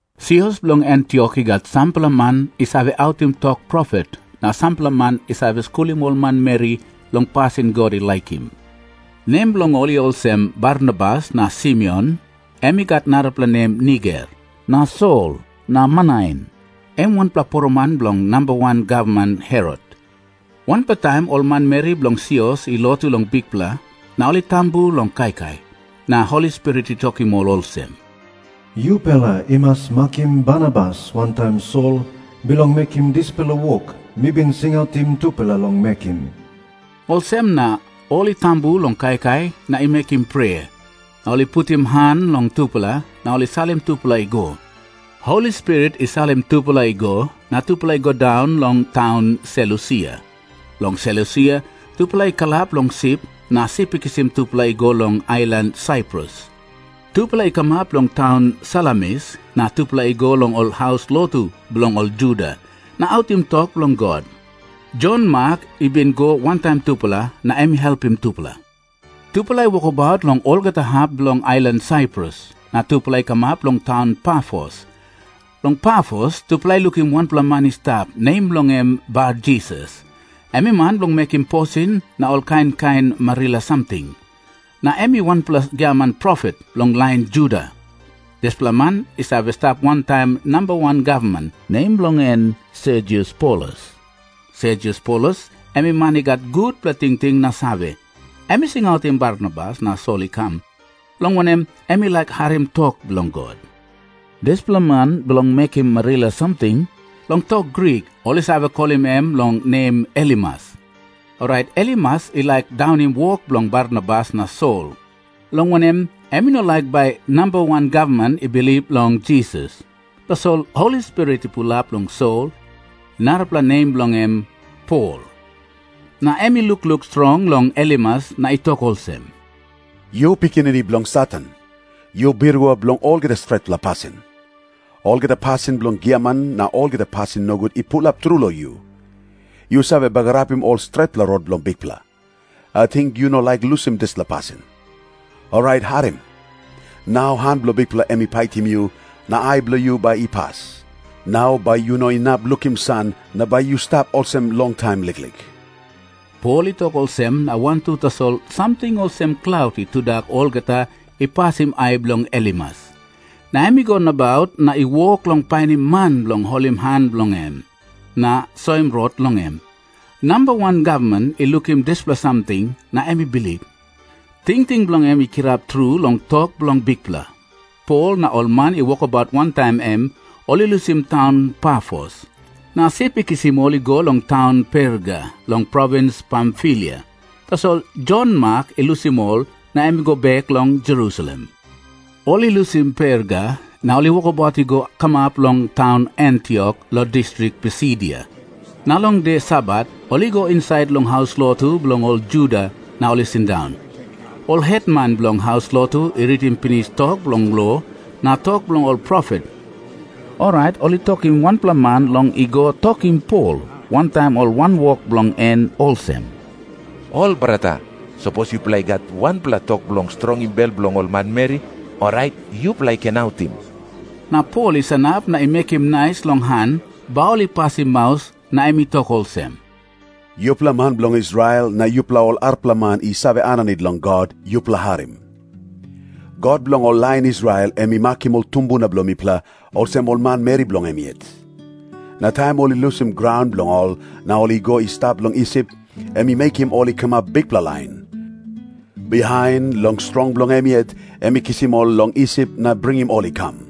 Sios bilong Antiok i gat sampela man i save autim tok profet na sampela man i save skulim ol manmeri long pasin God i laikim. Nem bilong ol i olsem, Barnabas, na Simeon, em i gat narapela nem Niger, na Lusius bilong taun Sairini, na Sol, na Manain, em wanpela poroman bilong namba wan gavman Herot. Wanpela taim ol manmeri bilong sios i lotu long Bikpela na ol i tambu long kaikai. Na Holi Spirit i tokim ol olsem, "Yupela i mas makim Barnabas wantaim Sol bilong mekim dispela wok mi bin singautim tupela long mekim." Olsem na ol i tambu long kaikai na i mekim prea, na ol i putim han long tupela, na ol i salim tupela i go. Holi Spirit i salim tupela i go, na tupela i go daun long taun Selusia. Long Selusia tupela i kalap long sip, na sip i kisim tupela i go long ailan Saiprus. Tupela i kamap long taun Salamis, na tupela i go long ol haus lotu bilong ol Juda na autim tok bilong God. Jon Mak i bin i go wantaim tupela, na em i helpim tupela. Tupela i wokabaut long olgeta hap bilong ailan Saiprus, na tupela i kamap long taun Pafos. Long Pafos tupela i lukim wanpela man i stap, nem bilong en Barjisas. Em i man bilong mekim posin na ol kain kain marila samting. Na em i wanpela giaman profet bilong lain Juda. Dispela man i save stap wantaim namba wan gavman, nem bilong en Sergius Paulus. Sergius Paulus em i man i gat gutpela tingting na save. Em i singautim Barnabas na Sol i kam, long wanem, em i laik harim tok bilong God. Dispela man bilong mekim posin na marila samting, long tok Grik ol i save kolim em long nem Elimas. Orait Elimas i laik daunim wok bilong Barnabas na Sol, long wanem, em i no laik bai namba wan gavman i bilip long Jisas. Tasol Holi Spirit i pulap long Sol, narapela nem bilong en Pol, na em i lukluk strong long Elimas na i tok olsem, "Yu pikinini bilong Satan. Yu birua bilong olgeta stretpela pasin. Olgeta pasin bilong giaman na olgeta pasin nogut i pulap tru long yu. Yu save bagarapim olgeta stretpela rot bilong Bikpela. Ating yu no laik lusim dispela pasin? Orait harim. Nau han bilong Bikpela em i paitim yu, na ai bilong yu bai i pas. Nau bai yu no inap lukim san, na bai yu stap olsem longtaim liklik." Pol i tok olsem na wantu tasol samting olsem klaut i tudak olgeta i pasim ai bilong Elimas. Na em i go nabaut na i wok long painim man bilong holim han bilong em na soim rot long em. Namba wan gavman i lukim dispela samting, na em i bilip. Tingting bilong en i kirap tru long tok bilong Bikpela. Pol na ol man i wokabaut wantaim em ol i lusim taun Pafos, na sip i kisim ol i go long taun Perga long provins Pamfilia. Tasol Jon Mak i lusim ol, na em i go bek long Jerusalem. Ol i lusim Perga, na ol i wokabaut i go kamap long taun Antiok long distrik Pisidia. Na long de Sabat ol i go insait long haus lotu bilong ol Juda, na ol i sindaun. Ol hetman bilong haus lotu i ritim pinis tok bilong lo na tok bilong ol profet, orait ol i tokim wanpela man long i go tokim Pol wantaim ol wanwok bilong en olsem, "Ol brata, sapos yupela i gat wanpela tok bilong strongim bel bilong ol manmeri, orait yupela i ken autim." Na Pol i sanap na i mekim nais long han bai ol i pasim maus, na em i tok olsem, "Yupela man bilong Israel, na yupela ol arapela man i save aninit long God, yupela harim. God bilong ol lain Israel em i makim ol tumbuna bilong mipela olsem ol manmeri bilong em yet. Na taim ol i lusim graun bilong ol na ol i go i stap long Isip, em i mekim ol i kamap bikpela lain. Bihain, long strong bilong em yet, em i kisim ol long Isip na bringim ol i kam.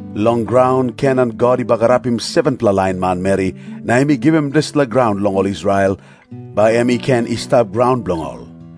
Long graun Kenan God i bagarapim 7-pela lain manmeri, na em i givim dispela graun long ol Israel, bai em i ken i stap graun bilong ol.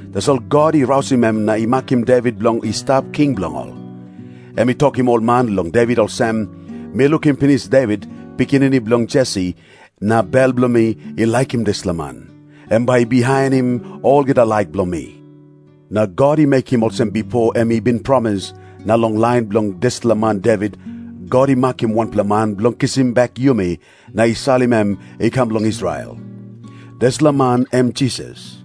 Tasol God i rausim em na i makim Devit bilong i stap king bilong ol. Em i tokim ol man long Devit olsem, 'Mi lukim pinis Devit, pikinini bilong Jesi, na bel bilong mi i laikim dispela man. Em bai i bihainim olgeta laik bilong mi.' Na God i mekim olsem bipo em i bin promis, na long lain bilong dispela man Devit, God i makim wanpela man bilong kisim bek yumi, na i salim em i kam long Israel. Dispela man em Jisas.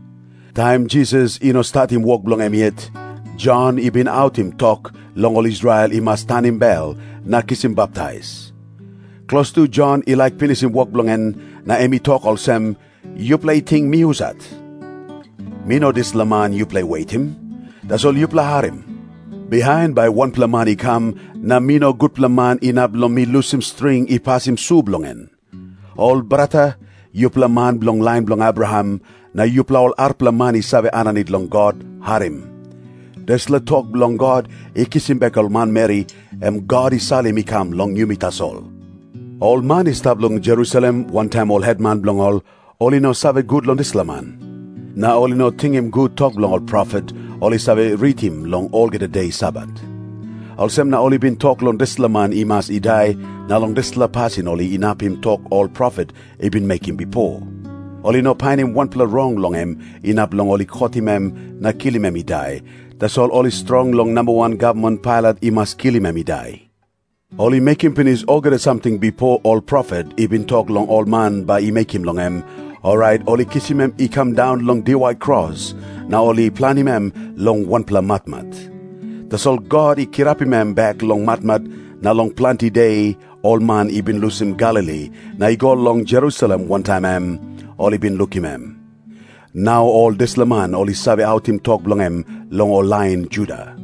"Taim Jisas i no statim wok bilong en yet, Jon i bin autim tok long ol Israel i mas tanim bel na kisim baptais. Klostu Jon i laik pinisim wok bilong en, na em i tok olsem, 'Yupela i ting mi husat? Mi no dispela man yupela i wetim. Tasol yupela harim. Bihain bai wanpela man i kam, na mi no gutpela man inap long mi lusim string i pasim su bilong en.' "Ol brata, yupela man bilong lain bilong Abraham, na yupela ol arapela man i save aninit long God, harim. Dispela tok bilong God i kisim bek ol manmeri, em God i salim i kam long yumi tasol. Ol man i stap long Jerusalem, wantaim ol hetman bilong ol, ol i no save gut long dispela man. Na ol i no tingim gut tok bilong ol profet, ol i save ritim long olgeta de Sabat. Olsem na ol i bin tok long dispela man i mas i dai, na long dispela pasin ol inapim tok ol profet i bin mekim bipo. Ol i no painim wanpela rong long em inap long ol i kotim em na kilim em i dai, tasol ol i strong long namba wan gavman Pailat i mas kilim em i dai. Ol i mekim pinis olgeta samting bipo ol profet i bin tok long ol man bai i mekim long em, orait ol i kisim em i kam daun long diwai kros, na ol i planim em long wanpela matmat. Tasol God i kirapim em bek long matmat, na long planti de ol man i bin lusim Galili na i go long Jerusalem wantaim em, ol i bin lukim em. Nau ol dispela man ol i save autim tok bilong em long ol lain Juda.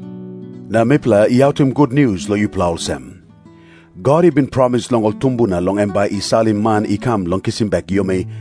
"Na mipela i autim gutnius long yupela olsem. God i bin promis long ol tumbuna long em bai i salim man i kam bilong kisim bek yumi,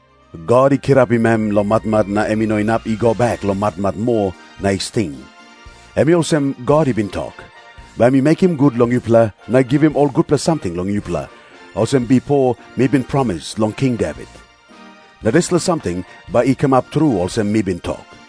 God i kirapim em long matmat, na em i no inap i go bek long matmat moa na i sting. Em i olsem God i bin tok, 'Bai mi mekim gut long yupela na givim ol gutpela samting long yupela, olsem bipo mi bin promis long King Devit. Na dispela samting bai i kamap tru olsem mi bin tok.'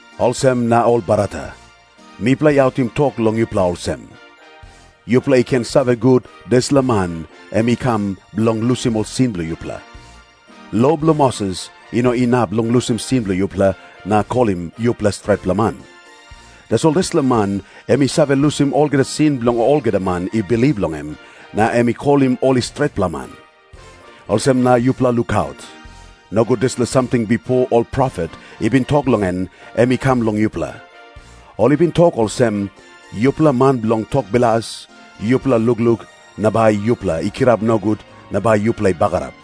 Olsem na, ol brata, mipela i autim tok long yupela olsem. Yupela i ken save gut, dispela man em i kam bilong lusim ol sin bilong yupela. Lo bilong Moses i no inap long lusim sin bilong yupela na kolim yupela stretpela man. Tasol dispela man em i save lusim olgeta sin bilong olgeta man i bilip long em, na em i kolim ol i stretpela man. Olsem na yupela lukaut. Nogut dispela samting bipo ol profet i bin tok long en, em i kam long yupela. Ol i bin tok olsem, 'Yupela man bilong tok bilas, yupela lukluk, na bai yupela i kirap nogut na bai yupela i bagarap.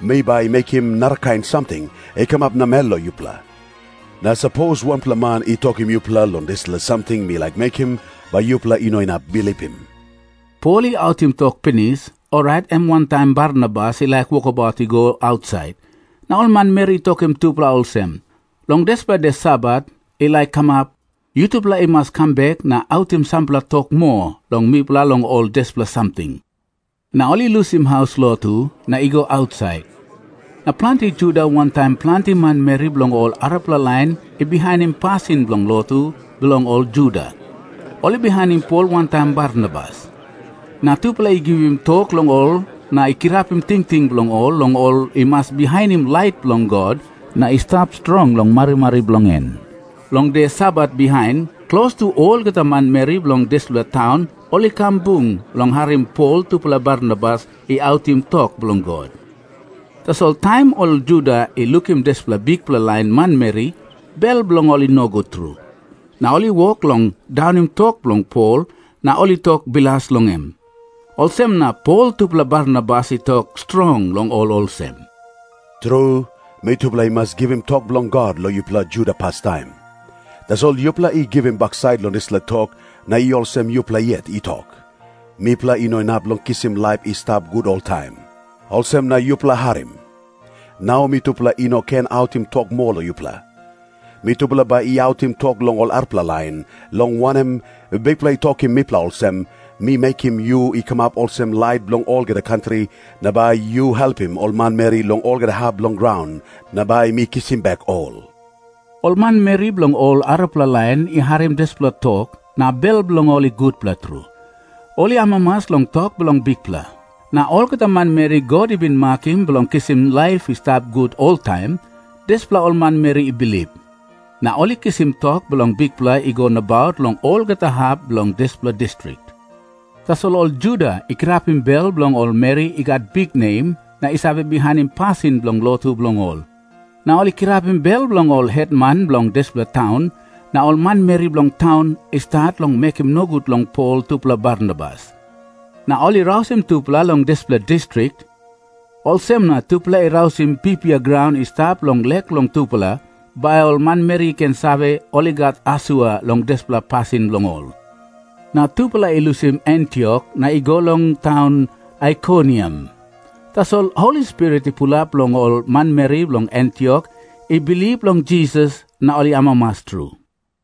Mi bai mekim narakain samting i kamap namel long yupela. Na sapos wanpela man i tokim yupela long dispela samting mi laik mekim, bai yupela i no inap bilipim.'" Pol i autim tok pinis, orait em wantaim Barnabas i laik wokabaut i go ausait, na ol manmeri i tokim tupela olsem, "Long dispela de Sabat i laik kamap, yutupela i mas kam bek na autim sampela tok moa long mipela long ol dispela samting." Na ol i lusim haus lotu na i go ausait, na planti Juda wantaim planti manmeri bilong ol arapela lain i bihainim pasin bilong lotu bilong ol Juda, ol i bihainim Pol wantaim Barnabas. Na tupela i givim tok long ol na kirapim tingting bilong ol long ol i mas bihainim laik bilong God na i stap strong long marimari bilong en. Long de Sabat bihain, klostu olgeta manmeri bilong dispela taun ol i kam bung bilong harim Pol tupela Barnabas i autim tok bilong God. Tasol taim ol Juda i lukim dispela bikpela lain manmeri, bel bilong ol i nogut tru. Na ol i wok long daunim tok bilong Pol, na ol i tok bilas long em. Olsem na Pol tupela Barnabas i tokaut strong long ol olsem, "Tru, mitupela i mas givim tok bilong God long yupela Juda pastaim. Tasol yupela i givim baksait long dispela tok, na i olsem yupela yet i tok, 'Mipela i no inap long kisim laip i stap gut oltaim.' Olsem na yupela harim. Nau mitupela i no ken autim tok moa long yupela. Mitupela bai i autim tok long ol arapela lain, long wanem, Bikpela i tokim mipela olsem, 'Mi mekim yu i kamap olsem lait bilong olgeta kantri, na bai yu helpim ol manmeri long olgeta hap bilong graun, na bai mi kisim bek ol.' " Ol manmeri bilong ol arapela lain i harim dispela tok, na bel bilong ol i gutpela tru. Ol i amamas long tok bilong Bikpela. Na olgeta manmeri God i bin makim bilong kisim laip i stap gut oltaim, dispela ol manmeri i bilip. Na ol i kisim tok bilong Bikpela i go nabaut long olgeta hap bilong dispela distrik. Tasol ol Juda i kirapim bel bilong ol meri i gat biknem na i save bihainim pasin bilong lotu bilong ol, na ol i kirapim bel bilong ol hetman bilong dispela taun, na ol manmeri bilong taun i stat long mekim nogut long Pol tupela Barnabas. Na ol i rausim tupela long dispela distrik. Olsem na tupela i rausim pipia graun i stap long lek bilong tupela, bai ol manmeri i ken save ol i gat asua long dispela pasin bilong ol. Na tupela i lusim Antiok na i go long taun Aikoniam. Tasol Holi Spirit i pulap long ol manmeri bilong Antiok i bilip long Jisas, na ol i amamas tru.